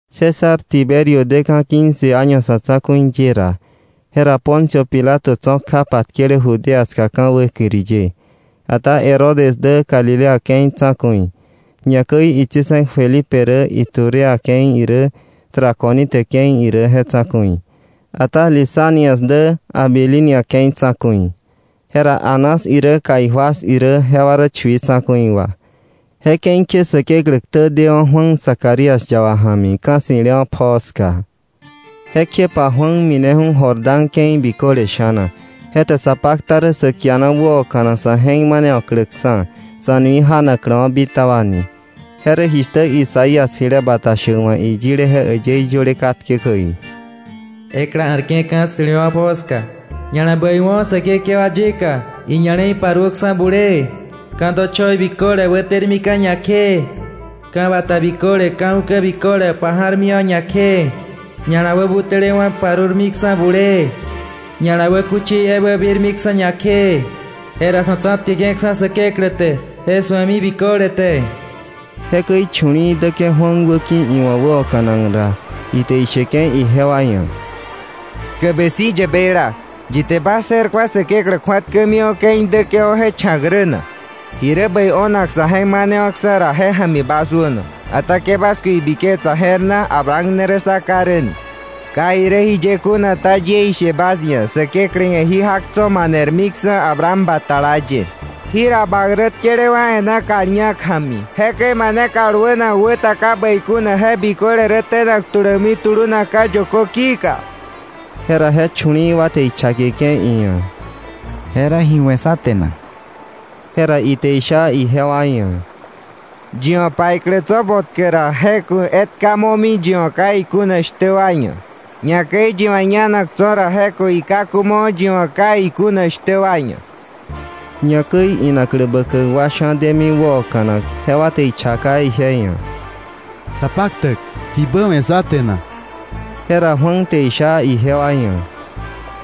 César Tiberio deka̱ quince año sa̱ tsa̱ku̱i ye ra, jera Poncio Pilato tso̱ kja patkele Judea ska ka̱ wäkiri ye, ata Herodes dä Galilea ke̱i tsa̱ku̱i, ñakäi itsi̱se̱k Felipe rä Iturea ke̱i irä Traconite ke̱i irä je tsa̱ku̱i, ata Lisanias dä Abilinia ke̱i tsa̱ku̱i. Jera Anás irä Caifás irä jewa rä chui tsa̱ku̱i wa. Je ke̱i kje Säkeklä ktä dewa̱ Juan Zacarías yaba ja̱mi ka̱ ssi̱lewa̱ pjoo ska. Jekjepa Juan mineju̱ Jordán ke̱i biköle sha̱na, je te sa pakta rä sa kiana wäoka̱nak sa̱ je̱k manewa̱kläksa̱, sa̱ nui janakläwa̱ bitaba ni. Je rä jishtä Isaías jile bata shäk wa̱ iyile je äyëí yöle katke käi: “Ekla a̱rke̱ ka̱ ssi̱lewa̱ pjoo ska: ‘Ña̱la bäiwo̱ Säkekewa yika, iña̱le̱i paruöksa̱ bulee. Ka̱ dochoi biköle wätermika̱ ñakjee. ka̱ bata biköle ka̱ ukä biköle paja̱rmiwa̱ ñakjee, ña̱la wäbutälewa̱ parurmiksa̱ bulee, ña̱la wäkuchi ebä birmiksa̱ ñakjee. Jera sa̱ tsa̱tkeke̱ksa̱ Säkeklä te je su̱emi biköle te.’” Jekäi chu̱li̱i̱ däke̱ Juan wäki̱ iwa̱ wäoka̱nak ra, ite isheke̱ ijewa ia̱: “¡Tkäbe si̱ yäbeila! ¿Yi te bas je̱r ku̱a Säkeklä kju̱atkämiwa̱ ke̱i däke̱wa̱ je cha̱k rä na? Jirä bäi o̱nak sa̱ je̱k manewa̱ksa̱ ra, je ja̱mi bas wäno. Ata ke bas ku̱ ibiketsa je̱r na: ‘Abraham ne rä sá ká rä’ ni; ka irä jiye kuna ta, yie ishe bas ia̱, Säkeklä ia̱ jí jak tso̱ manermiksa̱ Abraham batala ye. Jira bak rä tkelewa̱ e̱ná kal ñak ja̱mi. Jekäi mane kal wänak wä ta ka bäi kuna, je biköle rä tenak tulämi tulunakka̱ yökö ki̱ka.” Jera je chu̱li̱i̱ wa te ichakeke̱ iia̱: —¿Jera ji we̱ sá te na? Jera ite isha ijewa ia̱: —Yi wa̱ paiklä tso̱ botkä ra, je ku̱ etka momi yi wa̱ ka ikuna shtä wa ia̱; ñakäi yi wa̱ ñanak tso̱ ra, je ku̱ ikaku mo yi wa̱ ka ikuna shtä wa ia̱. Ñakäi inaklä bäkäk wa sha̱ demi wäoka̱nak, jewa te ichaka ije ia̱: —Sapaktäk, ¿jibä we̱ sá te na? Jera Juan te isha ijewa ia̱: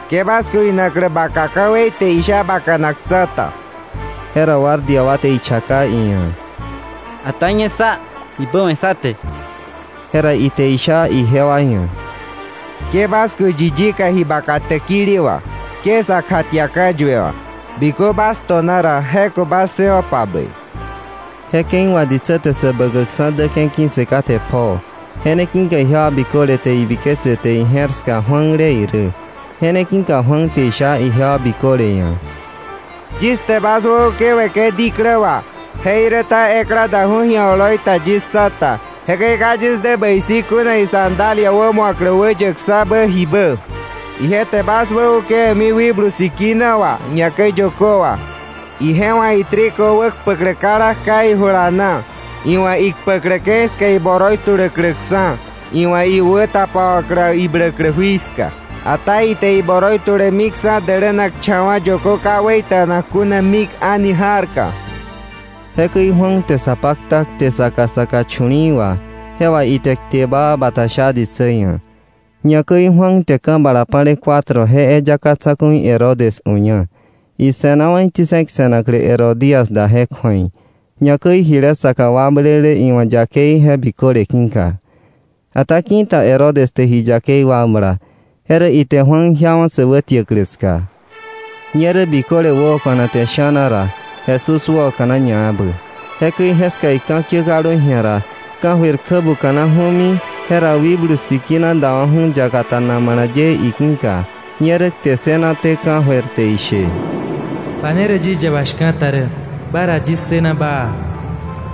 —Ke bas ku̱ inaklä baka ka̱wei te isha bakanak tsa̱ta. Jera guardia wa te ichaka iia̱: —Ata ñe sá, ¿jibä we̱ sá te? Jera ite isha ijewa ia̱: —Ke bas ku̱ yi yika ji baka täkili wà. Ke sa kjatia ka̱yue wà. Bikö bas to̱na ra, je ku̱ bas ssëwo̱pa bäi. Je ke̱i wà ditsä te Säbäkäkksa̱ däke̱ ki̱ssë kate pjoo; je ne ki̱ka ijewa biköle te ibiketse te ije̱r ska Juanle irä. Je ne ki̱ka Juan te isha ijewa biköle ia̱: “Yis te bas wäukewe̱ke̱ diklä wà; jeiräta ekla daju̱ ji̱a oloi ta yis tsa̱ta. Jekäi ka yis dä bäi si̱ kuna isandalia wämu̱aklä wäyäkksa̱bä jibä. Ije te bas wäukewe̱mi Wikblu Sikina wà, ñakäi yökö wà. Ije wa̱ itrigo wäkpäklä kala kja ijula na, iwa̱ ikpäklä ke̱i ska iboroi tuläkläkksa̱, iwa̱ iwä tapawa̱klä ibläklä jui ska. Ata ite iboroi tulemiksa̱ dälänakcha̱wa̱ yökö ka wäita̱nak kuna mik a̱ni ja̱rka.” Jekäi Juan te sa pakta kte saka saka chu̱li̱i̱ wà, je wà ite kte baa bata sha ditsä ia̱. Ñakäi Juan te ka̱ bala pa̱le cuatro je eyaka tsa̱ku̱i Herodes uña, ise̱nawa̱ itsi̱se̱k se̱naklä Herodías da je kju̱ei, ñakäi jile saka wakblele iwa̱ yakei je biköle ki̱ka. Ata ki̱ta Herodes te ji yakei wakbla, je rä ite Juan jiawa̱ sä wätiäklä ska. Ñerä biköle wäoka̱nate sha̱na ra, Jesús wäoka̱na ñaebä. Jekäi jeska ika̱kiä kaldu ji̱a ra, ka̱jöir kjä buka̱naju̱mi, jera Wikblu Sikina dewa̱ju̱ yakata namala ye iki̱ka, ñerä kte ssënaté ka̱jöir je te ishe: “Ba ne rä yis yaba shka̱ta rä, ba ra yis ssëna baa.”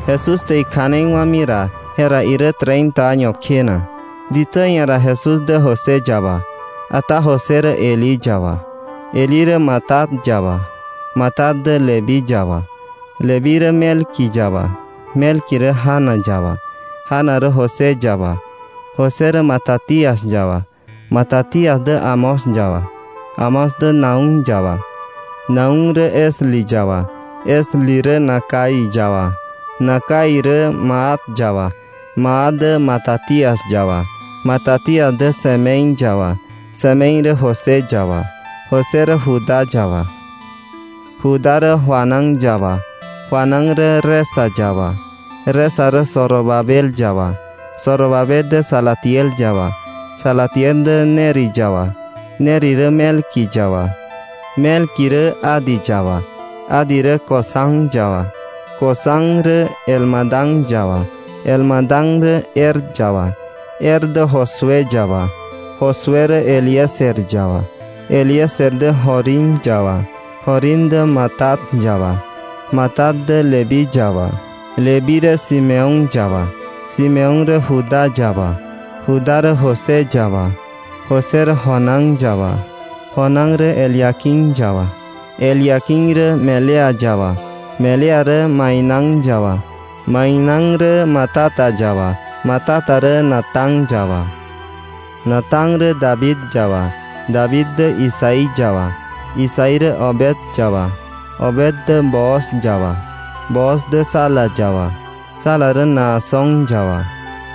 Jesús te ikja̱nei wa̱mi ra, jera irä treinta año kjena. Ditsä ia̱ ra Jesús dä José yaba. Ata José rä Elí yaba, Elí rä Matat yaba, Matat dä Leví yaba, Leví rä Melqui yaba, Melqui rä Jana yaba, Jana rä José yaba, José rä Matatías yaba, Matatías dä Amós yaba, Amós dä Nahum yaba, Nahum rä Esli yaba, Esli rä Nagai yaba, Nagai rä Maat yaba, Maat dä Matatías yaba, Matatías dä Semei yaba, Semei rä José yaba, José rä Judá yaba, Judá rä Joanán yaba, Joanán rä Resa yaba, Resa rä Zorobabel yaba, Zorobabel rä Salatiel yaba, Salatiel rä Neri yaba, Neri rä Melqui yaba, Melqui rä Adi yaba, Adi rä Cosam yaba, Cosam rä Elmadam yaba, Elmadam rä Er yaba, Er dä Josué yaba, Josué rä Eliezer yaba, Eliezer dä Jorim yaba, Jorim rä Matat yaba, Matat dä Leví yaba, Leví rä Simeón yaba, Simeón rä Judá yaba, Judá rä José yaba, José rä Jonán yaba, Jonán rä Eliaquim yaba, Eliaquim rä Melea yaba, Melea rä Mainán yaba, Mainán rä Matata yaba, Matata rä Natán yaba, Natán rä David yaba, David rä Isaí yaba, Isaí rä Obed yaba, Obed rä Booz yaba, Booz dä Sala yaba, Sala rä Naasón yaba,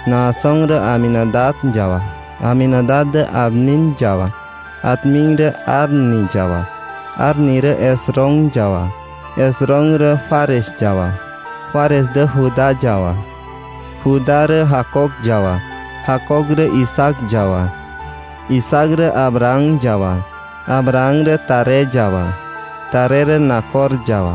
Naasón rä Aminadab yaba, Aminadab dä Admín yaba, Admín rä Arni yaba, Arni rä Esrom yaba, Esrom rä Fares yaba, Fares dä Judá yaba, Judá rä Jacob yaba, Jacob dä Isaac yaba, Isaac rä Abraham yaba, Abraham rä Taré yaba, Taré rä Nacor yaba,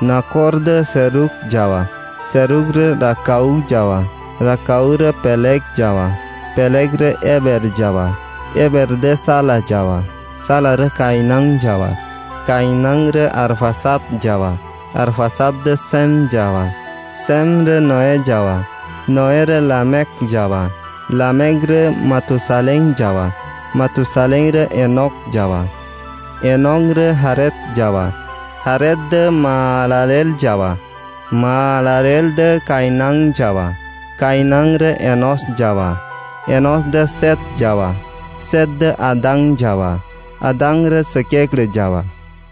Nacor dä Serug yaba, Serug dä Ragau yaba, Ragau rä Peleg yaba, Peleg rä Heber yaba, Heber dä Sala yaba, Sala rä Cainán yaba, Cainán rä Arfaxad yaba, Arfaxad dä Sem yaba, Sem rä Noé yaba, Noé rä Lamec yaba, Lamec rä Matusalén yaba, Matusalén rä Enoc yaba, Enoc rä Jared yaba, Jared dä Mahalaleel yaba, Mahalaleel dä Cainán yaba, Cainán rä Enós yaba, Enós dä Set yaba, Set dä Adán yaba, Adán rä Säkeklä yaba.